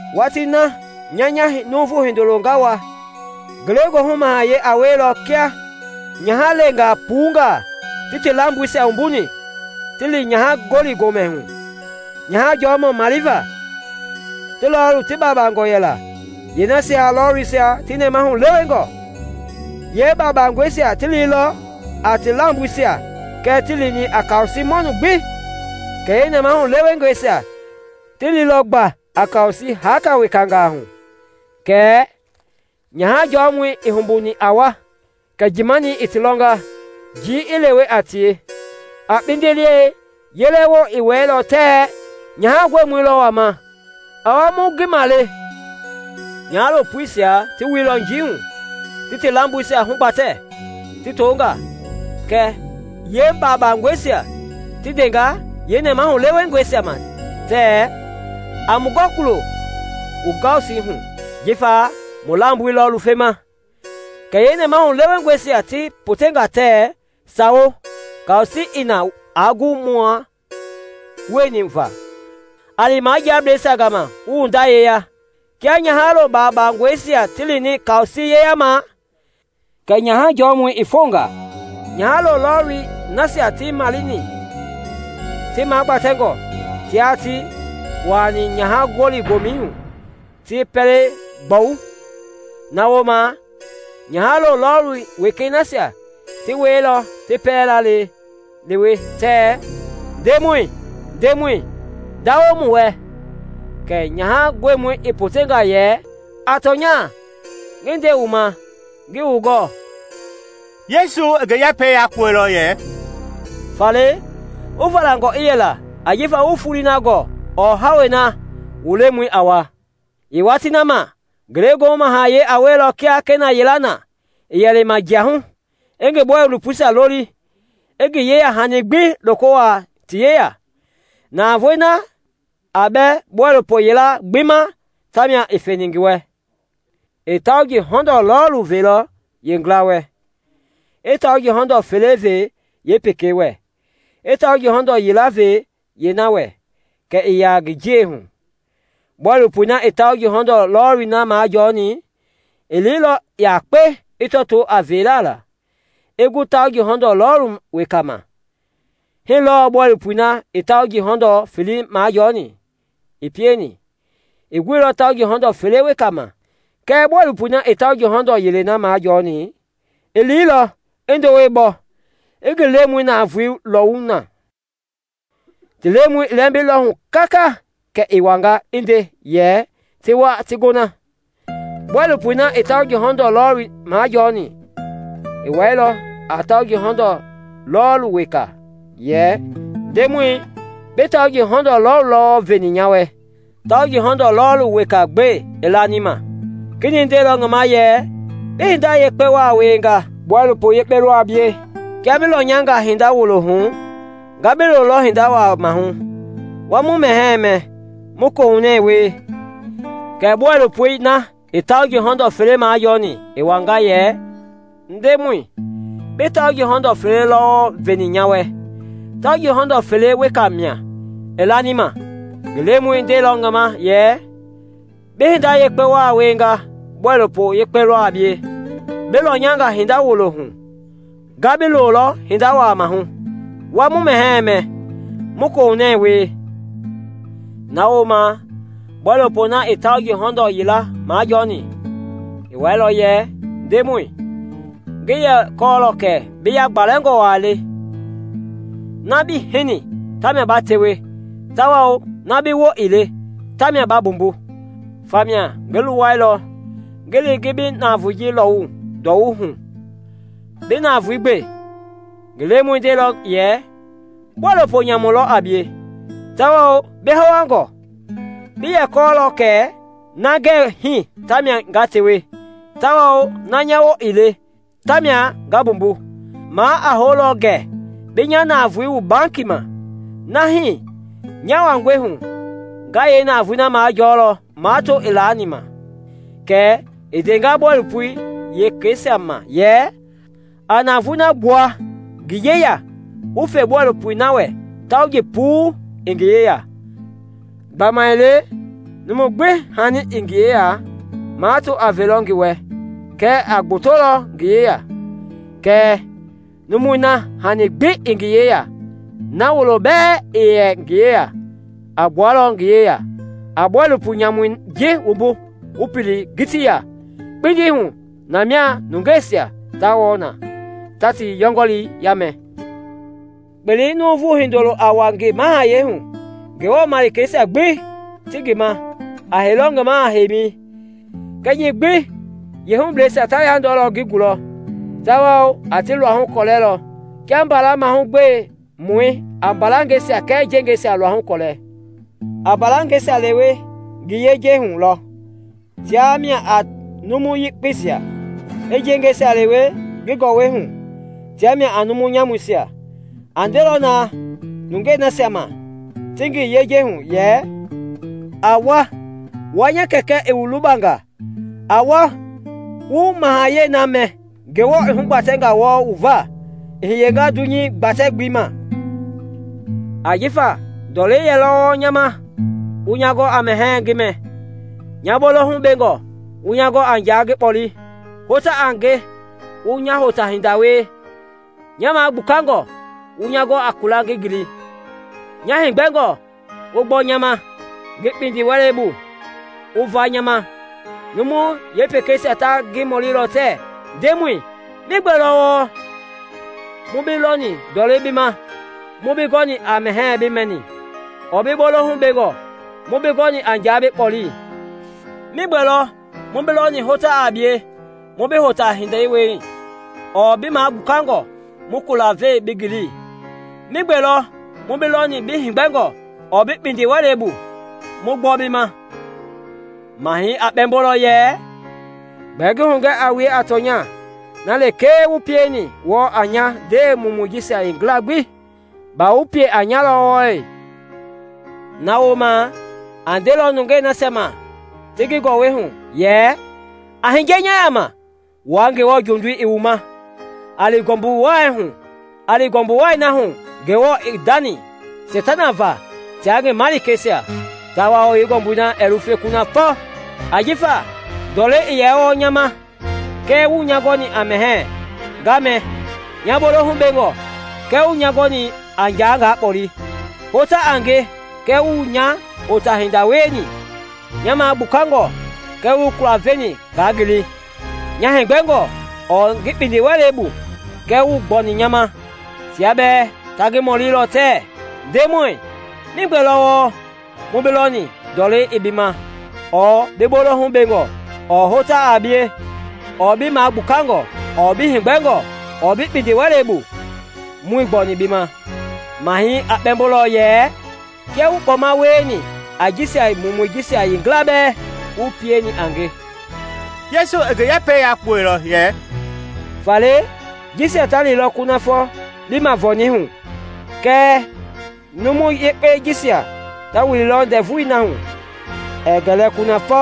“Watii na nya nya Nuuvu Hindoloi nga wa, ngelegoohu mahayɛi a wielɔ kia nyahalengaa puungaa, ti ti lamboisia wumbuni ti li nyaha-gɔli-gomɛi hu nyaha jɔmɔi maleva. Ti lɔɔlu ti baabangɔ yɛla, yeenasia lɔlisia ti nɛmahu lewengɔ. Yeebabangɔisia ti liilɔ a ti lamboisia kɛɛ tii lini a kaosii mɔnu gbi, kɛɛ yeenɛmahu lewengɔisia ti liilɔ gba a kaosii haaka wekangaa hu. Kɛɛ nyaha jɔmɔi ii humbuni a wa, kɛ njiimanii i ti lɔnga, njii i lewe a tie. “A kpindiliɛi yelewoi i wɛilɔ tɛɛ, ‘Nyaha gɔimɔi lɔ wama! A wa wu ngi male!’ Nyahalo puisia ti wuilɔ njii hu, ti ti lamboisia hugbatɛ, ti to nga. Kɛ yeebabangɔisia ti ndenga yeenɛmahulewengɔisia ma tɛɛ, ‘A mu gɔ kulo wu kaosii hu, jifa mu lamboisia lɔ lufema.’ Kɛɛ yeenɛmahulewengɔisia ti poteilɔ tɛɛ, ‘Sawo, kaosii i na aa gu mua wueni va; a li majiablɛisia gama wu wu nda yeya.’ Kia nyahalo baabangɔisia ti lini kaosii yeyamɛi kɛ nyaha jɔmɔi i fonga. Nyahalo lɔɔlii nasia i maleni ti magbatɛngɔ, tia tieni ti wuailɔ nyaha-gɔli-gomɛi hu ti yeepɛlei gbɔwu. “Na wooma nyahalo lɔɔlu wekeisia ti wɛilɔ ti pɛlei laalewe tɛɛ, ‘Ndemɔi, ndemɔi, ndawo mu wɛ.’ Kɛɛ nyaha gɔimɔi i poteilɔ yɛ, ‘A tɔnya, ngi nde wu ma, ngii wu gɔɔ.’” Yesu i ngi yɛpɛi yakpuɛilɔ yɛ, “Faale, wu valangɔ i yɛla ajifa wuii foloi gɔɔ ɔɔ hawei na wu Lemɔi a wa. “Yeewatii na ma, Ngelegoohu Mahayɛi a wielɔ kia kena yila na i yɛ lima jia hu, i ngi bɔilopoisia loli, i ngi yeyahani gbi loko wuaa ti yeya. Navoei na a bɛ bɔilopo yilayei gbi ma, tamia i feni ti wɛ. I tauji hɔndɔɔ lɔɔlu veilɔ yeengila wɛ, i tauji hɔndɔɔ fele ve yeepekei wɛ, i tauji hɔndɔɔ yila ve yeena wɛ, kɛ i ya ngi jiei hu. Bɔilopoi na i tauji hɔndɔɔ lɔlii majɔɔni i liilɔ yakpe i tɔtoo a veela la, i gu tauji hɔndɔɔ lɔɔlu weka ma. Hii lɔɔ bɔilopoi na i tauji hɔndɔɔ felei majɔɔni i pieni, i gu tauji hɔndɔɔ fele weka ma. Kɛɛ bɔilopoi na i tauji hɔndɔɔ yilei majɔɔni i liilɔ, i ndowei bɔ, i ngi lemɔi navoei lɔwu na. “Ti lemɔi i lɛmbilɔ hu kaka kɛ i wanga i nde yɛ ti wa ti gona. Bɔilopoi na i tauji hɔndɔɔ lɔɔli majɔɔni i wɛilɔ a tauji hɔndɔɔ weka yɛ, ‘Ndemɔi, bi tauji hɔndɔɔ lɔɔlu lɔ wɔɔ veni nya wɛ; tauji hɔndɔɔ lɔɔlu weka gbe i lani ma.’ Kenɛi ndeilɔ ngi ma yɛ, ‘Bi hinda yekpe waa wienga; bɔilopo yekpe lɔ a bie; kia bi lɔnyanga hinda wulo hu, nga bi lolɔ hinda waa maahu; wuaa mu mɛhɛɛ mɛ, mu kohunɛ wie.’ Kɛ bɔilopoi na i tauji hɔndɔɔ felei majɔɔni i wanga yɛ, ‘Ndemɔi, bi tauji hɔndɔɔ felelɔ wɔɔ veni nya wɛ; tauji hɔndɔɔ fele weka mia i lani ma.’ Ngi Lemɔi ndeilɔ yɛ, ‘Bi hinda yakpe waa wienga; bɔilopo yekpe lɔ a bie; bi lɔnyanga hinda wulo hu, nga bi lolɔ hinda waa maahu; wuaa mu mɛhɛɛ mɛ, mu kohunɛ wie.’ Na wooma bɔilopoi na i tauji hɔndɔɔ yilei majɔɔni i wɛilɔ yɛ, ‘Ndemɔi, ngi yɛ kɔɔlɔ kɛ bi yagbalɛngɔ waa le, na bii hini tamia ba tewe, tawao na bi woo ii le tamia ba mbumbu; famia ngi luwɛilɔ ngi li ngi bi navoei lɔwu ndowei hu. Bi navoei gbe!’ Ngi lemɔi ndeilɔ yɛ, ‘Bɔilopo nyamu lɔ a bie tawao bi hawangɔ! Bi yɛ kɔɔlɔ kɛ na ngɛɛ hii tamia nga tewe, tawao na nya woo ii le tamia nga mbumbu. Maa a houlɔ gɛ bi nya navoei wu bankii ma, na hii nya wangɔi hu nga yeenavoei majɔɔlɔ mato i laani ma.’ Kɛ i ndenga bɔilopoi wekeisia ma yɛ, ‘A navoei na gbua ngi yeya wu fe bɔilopoi na wɛ tauji puii i ngi yeya. Gbamaile numu gbi hani i ngi yeya, mato a velɔ ngi wɛ kɛ i gbotonga ngi yeya; kɛɛ numui na hani gbi ii ngi yeya, na wuloi bɛɛ a yɛ ngi yeya, a gbualɔ ngi yeya. A bɔilopo nyamui ji wumbu wu pili ngiti ya kpindi hu; na mia nungeisia ta wɔɔ na ta ti yɔngɔlii yaamɛ.’ “Kpelei Nuuvu Hindoloi a wa ngi mahayɛi hu; Ngewɔ malikeisia gbi ti ngi ma, a heilɔ ngi maha-heimi. Kɛnyɛi gbi yeehubleisia ta yandɔlɔ ngi gulɔ tawao a ti luahu gɔlɛlɔ kia mbala mahugbemɔi a mbalangɛisia kɛɛ njengɛisia luahu gɔlɛ. A mbalangɛisia lewe ngi yejei hu lɔ, tia mia a numu yekpeisia, i njengɛisia lewe ngi gɔwɔi hu, tia mia a numu nyamuisia. A ndelɔ na nungei nasia ma ti ngi yejei hu yɛ, ‘A wa, wua nya Kɛkɛ i wu lubanga! A wa wu mahayɛi na mɛ Ngewɔ i hugbatɛnga wɔɔ wu va i hiye dunyei gbatɛ-gbelei ma; ajifa ndɔlɛ yɛlɔ wɔɔ nya ma wu nya gɔ a mɛhɛɛ ngi mɛ, nya bolohu bengɔ wu nya gɔ a nja ngi kpɔle, hota a nge, wu nya hota-hinda wie, nya magbukangɔ, wu kula ve ngi ngili, nya heegbɛngɔ, wu gbɔ nya ma, ngi kpindiwɛlei bu, wu va nya ma.’ Numu yekpeisia ta ngi mɔlilɔ tɛɛ, ‘Ndemɔi, migbe lɔ wɔɔ mu bi lɔni ndɔlɛ bi ma mu bi gɔni a mɛhɛɛ bi mɛ, ɔɔ bi bolohu bengɔ mu bi gɔ a nja bi kpɔle? Migbe lɔ mu bi lɔni hota a bie mu bi hota-hinda wie, ɔɔ bi magbukangɔ mu kula ve bi ngili? Migbe lɔ mu bi lɔni bi heegbɛngɔ ɔɔ bi kpindiwɛlɛ bu mu gbɔ bi ma?’ Mahɛi a kpɛmbolɔ yɛ, ‘Gbɛɛ ngi hugɛ a wue a tɔnya, na lekee wu pienga wɔɔ a nya ndewe mumui jisia yeengila gbi baa ii ti ma wɔɔ, wu pieni a nya lɔ.’ “Na wooma a ndelɔ nungei nasia ma ti ngi gɔwɔhui yɛ, ‘A hiye nya yaama, wua Ngewɔ jondii i wu ma. A li ngɔmbu wai na hu Ngewɔ i ndani Seitana va tia ngi malikeisia tawao yeengɔmbui ɛɛ lufe kunafɔ; ajifa ndɔlɛ yɛlɔ wɔɔ nya ma, kɛɛ wuii nya gɔni a mɛhɛɛ nga mɛ, nya bolohu bengɔ. Kɛɛ wuii nya gɔni a nja nga kpɔle; hota a nge kɛɛ wuii nya hota-hinda wieni, nya magbukangɔ kɛɛ wuii kula veni nga ngili, nya heegbɛngɔ ɔɔ ngi kpindiwɛlei bu kɛɛ wuii gbɔni nya ma.’ Tia bɛɛ ta ngi mɔlilɔ tɛɛ, ‘Ndemɔi, migbe lɔ wɔɔ mu bi lɔni ndɔlɛ i bi ma ɔɔ bi bolohu bengɔ ɔɔ hota a bie ɔɔ bi magbukangɔ ɔɔ bi heegbɛngɔ ɔɔ bi kpindiwɛlei bu muii gbɔni bi ma?’ Mahɛi a kpɛmbolɔ yɛ, ‘Kia wuii kpɔma wieni a jisia mumuisia yeengila bɛɛ, wuii pieni a nge.’” Yesu i ngi yɛpɛi yakpuɛilɔ yɛ, “Faale jisia ta lilɔ kunafɔ liimavɔɔni hu, kɛɛ numu yekpei j isia ta wililɔ ndɛvui na hu ɛɛ gɛlɛ kunaf� �.”